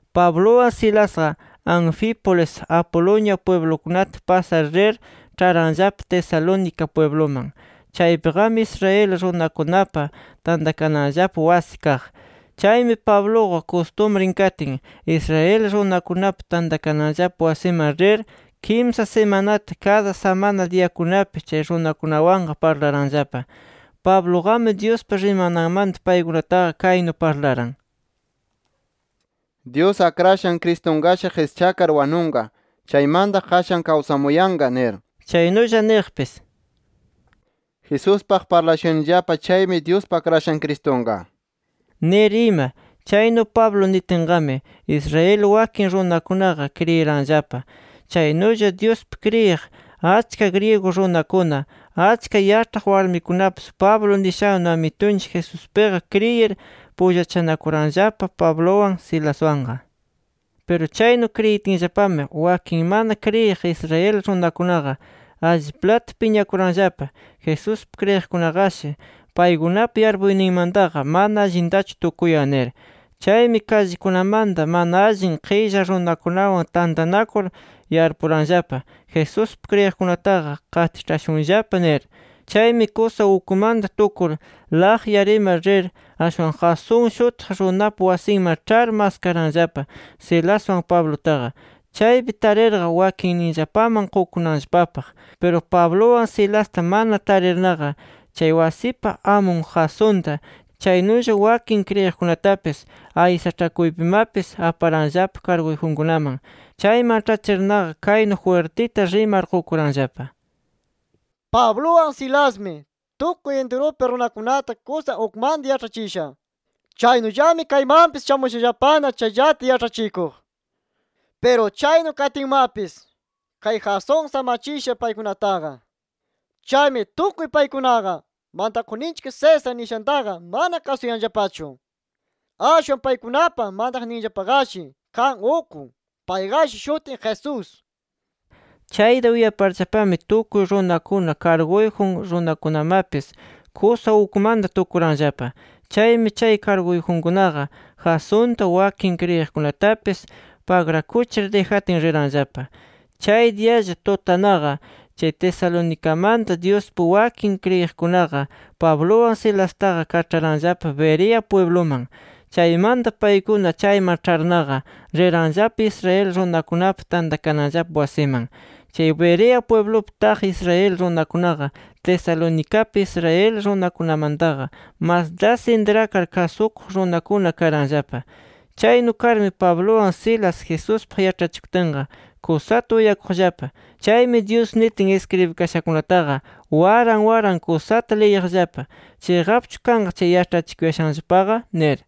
Pabluwan Silasqa, Anfípolis Apolonia pwiblukunata pasar rir, ĉharanllapa Tesalónica pwibluman. Chaypiqami, Israel runakunapa tantakananllapa wasi kaq. Chaymi Pabluqa, kustumrin katin, Israel runakunapa tantakananllapa wasiman rir, kimsa simanata kada samana diyakunapi chay runakunawanqa parlaranllapa. Pabluqami, Dyuspa rimananmanta paykunataqa kaynu parlaran: “Dyus Akrashan Cristunqashi qischakar wanunqa. Chaymanta, qashan kawsamuyanqa” nir. Chaynulla niqpis: “Jesuspaq parlashuyanillapa chaymi, Dyuspa Akrashan Cristunqa” nir ima. Chaynu Pablo nitinqami Israel wakin runakunaqa kriyiranllapa. Chaynulla Dyuspi kriyiq achka griego runakuna, achka yaĉhaq warmikunapis Pablo nishannu Amitunchik Jesuspiqa kriyir pullachanakuranllapa Pabluwan, Silaswanqa. Piru chaynu kriyitinllapami, wakin mana kriyiq Israel runakunaqa alliplata piñakuranllapa “Jesuspi kriyiqkunaqashi paykunapa yarpuyninmantaqa mana allintachu tukuyan” nir. Chaymi kallikunamanta mana allin qilla runakunawan tantanakur, yarpuranllapa Jesuspi kriyiqkunataqa qatiĉhashunllapa nir. Chaymi kusa ukmanta tukur, laqyar ima rir, ashwan Jasón shutiq runapa wasinman ĉhar maskaranllapa Silaswan Pablutaqa, chaypi tarirqa wakinninllapaman qukunanllapapaq. Piru Pabluwan Silasta mana tarirnaqa, chay wasipa amun Jasonta, chaynulla wakin kriyiqkunatapis aysaĉhakuypimapis aparanllapa karguyjunkunaman. Chayman ĉhachirnaqa kaynu jwirtita rimar qukuranllapa: —¡Pabluwan Silasmi tukuy intirupi runakunata kusa ukmanta yaĉhachisha! Chaynullami kaymanpis shamushallapana chayllata yaĉhachikuq. ¡Piru chaynu katinmapis, kay Jasón samachisha paykunataqa! ¡Chaymi tukuy paykunaqa, mantakuqninchik César nishantaqa mana kasuyanllapachu! Ashwan paykunapa mantaqninllapaqashi kan uk. Payqashi shutin Jesús nir. Chayta uyaparllapami tukuy runakuna, karguyjun runakunamapis kusa ukmanta tukuranllapa. Chaymi chay karguyjunkunaqa, Jasonta wakin kriyiqkunatapis pagrakuchir dijatin, riranllapa. Chay diyalla tutanaqa, chay Tesalonicamanta Dyuspi wakin kriyiqkunaqa Pabluwan Silastaqa kaĉharanllapa Berea pwibluman. Chaymanta paykuna chayman ĉharnaqa, riranllapa Israel runakunapa tantakananllapa wasiman. Chay Berea pwiblupi taq Israel runakunaqa, Tesalonicapi Israel runakunamantaqa mas das intrakar kasukuq runakuna karanllapa. Chaynu karmi Pabluwan Silas, Jesuspaq yaĉhachikutinqa, kusata uyakuqllapa. Chaymi Dyus nitin iskribikashakunataqa waran waran kusata liyiqllapa, chiqapchu kanqa chay yaĉhachikuyashanllapaqa nir.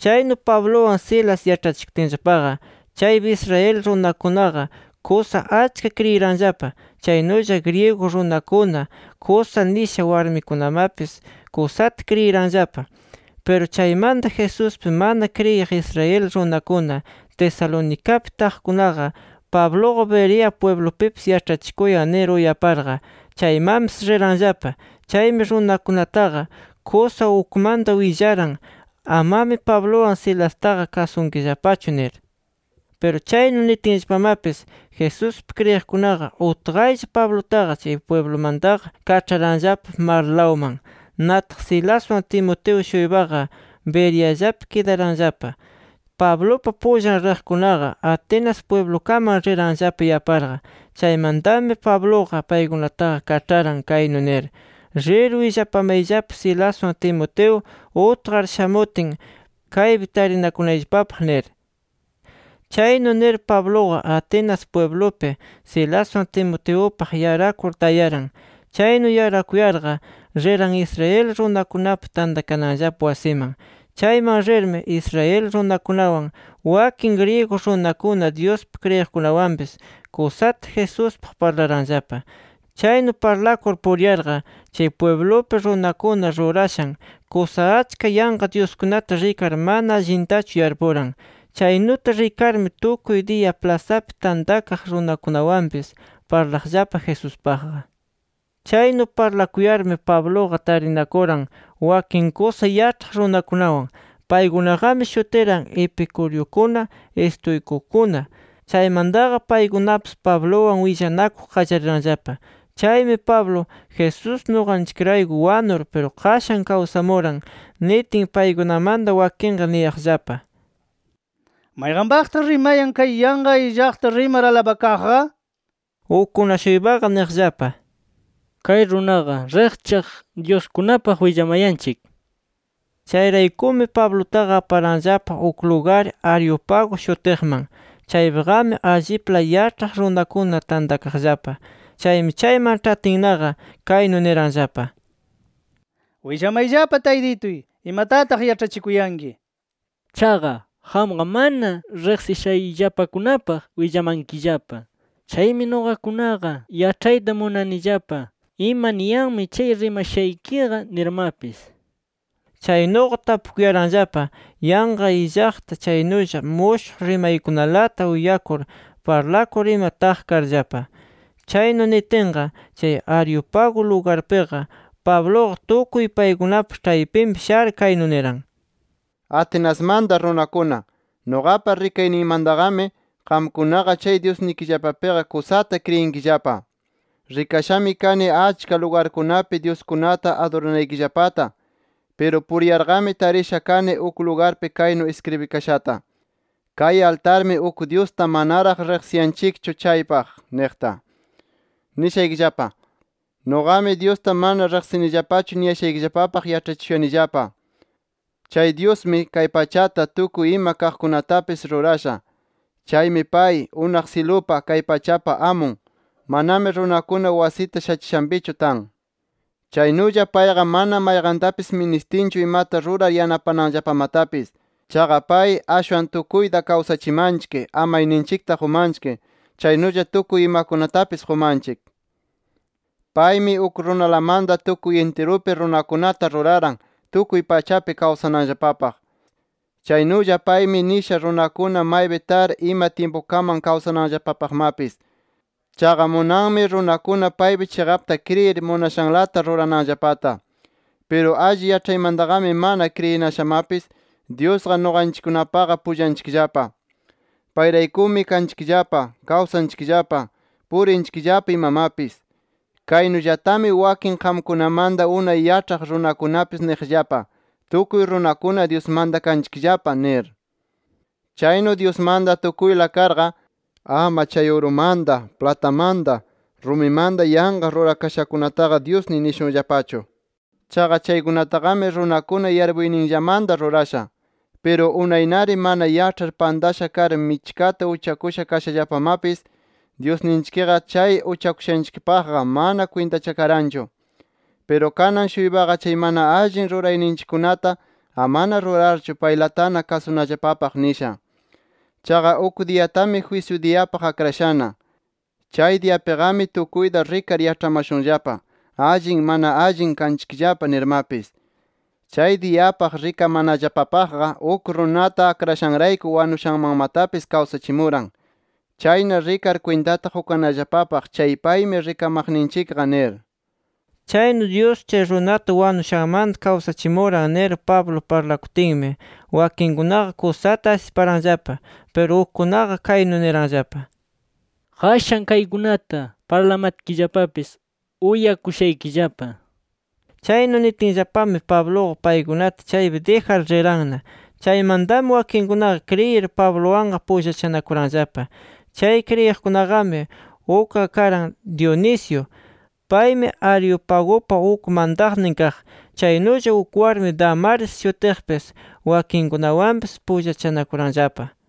Chaynu Pabluwan Silas yaĉhachikutinllapaqa, chaypi Israel runakunaqa kusa achka kriyiranllapa. Chaynulla griego runakuna, kusa nisha warmikunamapis, kusata kriyiranllapa. Piru chaymanta, Jesuspi mana kriyiq Israel runakuna Tesalonicapi taqkunaqa, Pabluqa Berea pwiblupipis yaĉhachikuyan nir uyaparqa, chaymanpis riranllapa. Chaymi runakunataqa kusa ukmanta willaran, amami Pabluwan Silastaqa kasunkillapachu nir. Piru chaynu nitinllapamapis, Jesuspi kriyiqkunaqa utqaylla Pablutaqa chay pwiblumantaqa kaĉharanllapa marlawman. Nataq Silaswan Timoteo-shuypaqa Bereallapi kidaranllapa. Pablupa pullan riqkunaqa, Atenas pwiblukaman riranllapa yaparqa. Chaymantami Pabluqa paykunataqa kaĉharan kaynu nir: “Rir willapamayllapa Silaswan Timoteo utqar shamutin, kaypi tarinakunayllapapaq” nir. Chaynu nir Pabluqa Atenas pwiblupi Silaswan Timoteupaq yarakur tayaran. Chaynu yarakuyarqa riran Israel runakunapa tantakananllapa wasiman. Chayman rirmi Israel runakunawan, wakin griego runakuna Dyuspi kriyiqkunawanpis kusata Jesuspaq parlaranllapa. Chaynu parlakur puriyarqa chay pwiblupi runakuna rurashan kusa achka yanqa dyuskunata rikar mana allintachu yarpuran. Chaynuta rikarmi tukuy diya plasapi tantakaq runakunawanpis parlaqllapa Jesuspaqqa. Chaynu parlakuyarmi Pabluqa tarinakuran wakin kusa yaĉhaq runakunawan. Paykunaqami shutiran Epicureukuna Estoicukuna. Chaymantaqa paykunapis Pabluwan willanakuq qallariranllapa. Chaymi Pablo, “Jesús nuqanchikrayku wanur, piru qashan kawsamuran” nitin, paykunamanta wakinqa niyaqllapa: —¿Mayqanpaqtaq rimayan, kay yanqa illaqta rimar alabakaqqa? nir. Ukkuna-shuypaqa niqllapa: —Kay runaqa riqchaq dyuskunapaq willamayanchik nir. Chayraykumi, Pablutaqa aparanllapa uk lugar Areópago shutiqman. Chaypiqami allipla yaĉhaq runakuna tantakaqllapa. Chaymi, chayman ĉhatinnaqa kaynu niranllapa: —Willamayllapa taytituy imatataq yaĉhachikuyanki. Chaqa qamqa mana riqsishayllapakunapaq willamankillapa. Chaymi nuqakunaqa yaĉhayta munanillapa, ima niyanmi chay rimashaykiqa nirmapis. Chaynuqa tapukuyaranllapa yanqa illaqta, chaynulla mushuq rimaykunalata uyakur parlakur ima taq karllapa. Chaynu nitinqa, chay Areópago lugarpiqa Pabluqa tukuy paykunapa ĉhaypinpi shar, kaynu niran: “Atenasmanta runakuna, nuqapa rikayniymantaqami qamkunaqa chay dyusnikillapapiqa kusata kriyinkillapa. Rikashami kani achka lugarkunapi dyuskunata aduranaykillapata. Piru puriyarqami tarisha kani uk lugarpi kaynu iskribikashata: ‘KAY ALTARMI UK DYUSTA MANARAQ RIQSIYANCHIKCHU CHAYPAQ’ niqta. Nishaykillapa: Nuqami Dyusta mana riqsinillapachu niyashaykillapapaq yaĉhachishuyanillapa. “Chay Dyusmi, kay pachata, tukuy ima kaqkunatapis rurasha. Chaymi pay, unaq syilupa, kay pachapa Amun. Manami runakuna wasita shachishanpichu tan. Chaynulla payqa mana mayqantapis ministinchu imata rurar yanapananllapamatapis. Chaqa pay, ashwan tukuyta kawsachimanchik, amayninchikta qumanchik, chaynulla tukuy imakunatapis qumanchik. Paymi uk runalamanta tukuy intirupi runakunata ruraran, tukuy pachapi kawsananllapapaq. Chaynulla paymi nisha runakuna maypi tar ima tyimpukaman kawsananllapapaqmapis. Chaqa munanmi runakuna paypi chiqapta kriyir, munashanlata rurananllapata. Piru alli yaĉhaymantaqami mana kriyinashamapis, Dyusqa nuqanchikkunapaqa pullanchikllapa. Payraykumi kanchikllapa, kawsanchikllapa, purinchikllapa, imamapis. Kaynullatami wakin qamkunamanta unay yaĉhaq runakunapis niqllapa: ‘Tukuy runakuna Dyusmanta kanchikllapa’ nir. “Chaynu Dyusmanta tukuyla karqa, ama chay urumanta, platamanta, rumimanta yanqa rurakashakunataqa dyusniy nishunllapachu. Chaqa chaykunataqami runakuna yarpuyninllamanta rurasha. Piru unaynari mana yaĉhar pantasha kar michkata uchakusha kashallapamapis Dyusninchikqa chay uchakushanchikpaqqa mana kwintachakaranchu. Piru kanan-shuypaqa chay mana allin rurayninchikkunata amana rurarchu, paylatana kasunallapapaq nisha. Chaqa uk diyatami jwisyu diyapaq akrashana. Chay diyapiqami tukuyta rikar yaĉhamashunllapa ‘Allin mana allin kanchikllapa’ nirmapis. Chay diyapaq rikamanallapapaqqa uk runata akrashanrayku wanushanmanmatapis kawsachimuran. Chayna rikar kwintata qukanallapapaq chay paymi rikamaqninchikqa nir”. Chaynu “Dyus chay runata wanushanmanta kawsachimuran” nir Pablo parlakutinmi, wakinkunaqa kusata asiparanllapa. Piru ukkunaqa kaynu niranllapa: —Qashan kaykunata parlamatkillapapis uyakushaykillapa nir. Chaynu nitinllapami, Pabluqa paykunata chaypi dijar riranna. Chaymantami wakinkunaqa kriyir Pabluwanqa pullachanakuranllapa. Chay kriyiqkunaqami ukqa karan Dionisio. Paymi Areopagupa uk mantaqnin kaq. Chaynulla uk warmi Dámaris shutiqpis wakinkunawanpis pullachanakuranllapa.